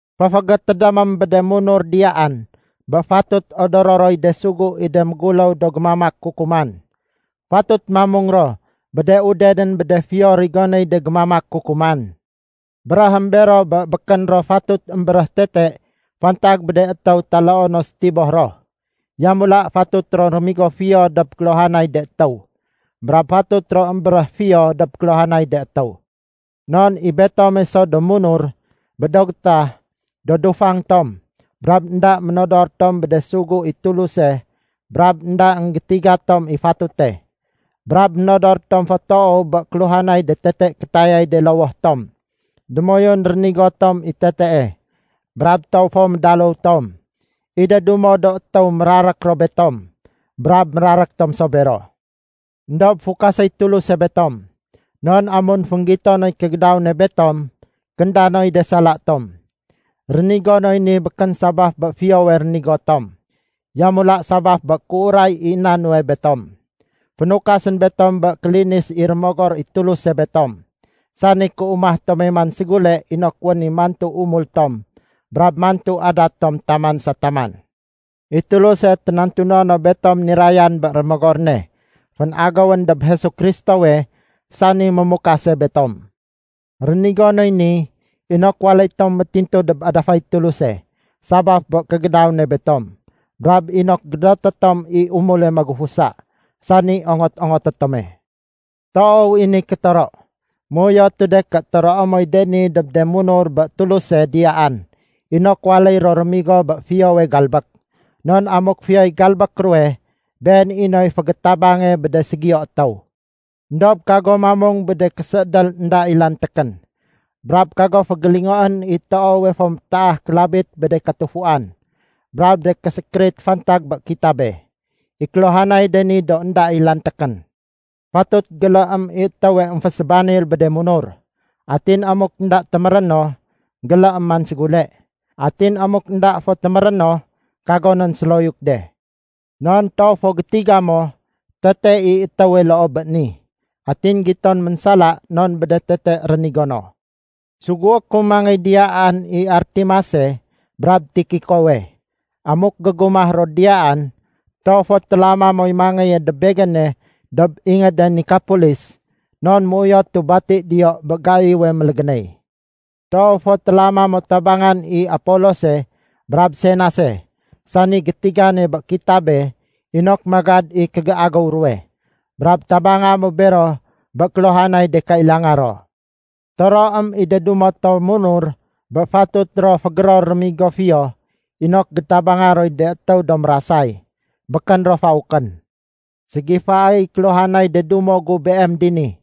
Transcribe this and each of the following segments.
Féfégétédémém bé de munur diyaan bé fatut odoro roy de sugu i de méguléw do gémamak kukuman. Fatut mamung ro bé de udenén bé de fiyo rigonéy de gémamak kukuman. Béréhém bero bé békén ro fatut émbéréh tete fantag bé de étéw taloo no sétiboh ro. Yamula fatut ro rémigo fiyo dob kéluhanay de étéw, brab fatut ro émbéréh fiyo dob kéluhanay de étéw. Non i betome so do munur, bé do gétah, do dufang tom brab énda ménodor tom bé de sugu i Tuluse brab énda énggétiga tom i fatute. Brab ménodor tom fo toow bé kéluhanay de tete kétayay de lowoh tom. Démoyun rénigo tom i tetee, brab toow fo médaléw tom. I de dumo do étéw mérarék ro betom brab mérarék tom so bero. Endob fukaséy Tuluse betom, non amun fénggito noy kégédaw ne betom, kénda noy de sala tom. Rénigo noy ni békén sabaf bé fiyowe rénigo tom, yamula sabaf bé kéuray i na nuwe betom. Fénukasén betom bé kélinis i Rémogor i Tuluse betom, sani kéumah tome man ségule inok wén i mantu umul tom brab mantu adat tom taman sa taman. I Tuluse ténantuno no betom nirayan bé Rémogor ne fénagéwén dob Jesu Kristowe, sani mémukase betom. Rénigo noy ni inok waléy tom métintu dob adafay Tuluse sabaf bé kégédaw ne betom, brab inok gédoté tom i umule magufusa, sani ongot-ongoté tome. Toow i ni kétoro. Méuyotu de ké toroé moy de ni dob de munur bé Tuluse diyaan inok waléy ro rémigo bé fiyowe galbék. Non amuk fiyoy galbék ruwe, been i noy fégétabange bé de ségiyo étéw. Endob kago mamung bé de késéédél énda i lantékén. Brab kago fégélingoén i toowe fo métaah kélabit bé de katufuan brab de késékérit fantag bé kitabe. I kéluhanay de ni do énda i lantékén. Fatut géléém i étéwe émfésébanil bé de munur. Atin amuk énda téméré no, géléém man ségule. Atin amuk énda fo téméré no, kago nén séloyuk de. Non toow fo gétiga mo tete i étéwe loo bé ni, atin giton ménsala non bé de tete rénigo no. Sugué ku mangéy diyaan i Artemase brab Tikikowe. Amuk gégumah ro diyaan, toow fo télama moy mangéye dob begéne dob ingéde Nikapolis, non méuyotu bati diyo bé gaiwe mélégénéy. Toow fo télama mo tabangan i Apolose brab Senase sani gétigane bé kitabe inok magad i kégéagéw ruwe. Brab tabanga mo bero bé kéluhanay de kailanga ro. Toroém i de dumo to munur bé fatut ro fégéror rémigo fiyo inok gétabanga roy de étéw do mérasay. Békén ro faukén. Ségifaéy kéluhanay de dumo gu beem dini.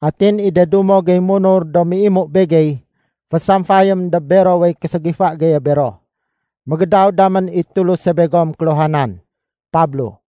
Atin i de dumo gey munur do méimu begey, fésamfayém dob berowey késégifa geye bero. Mégédaw damén i Tuluse begom kéluhanan. Pablo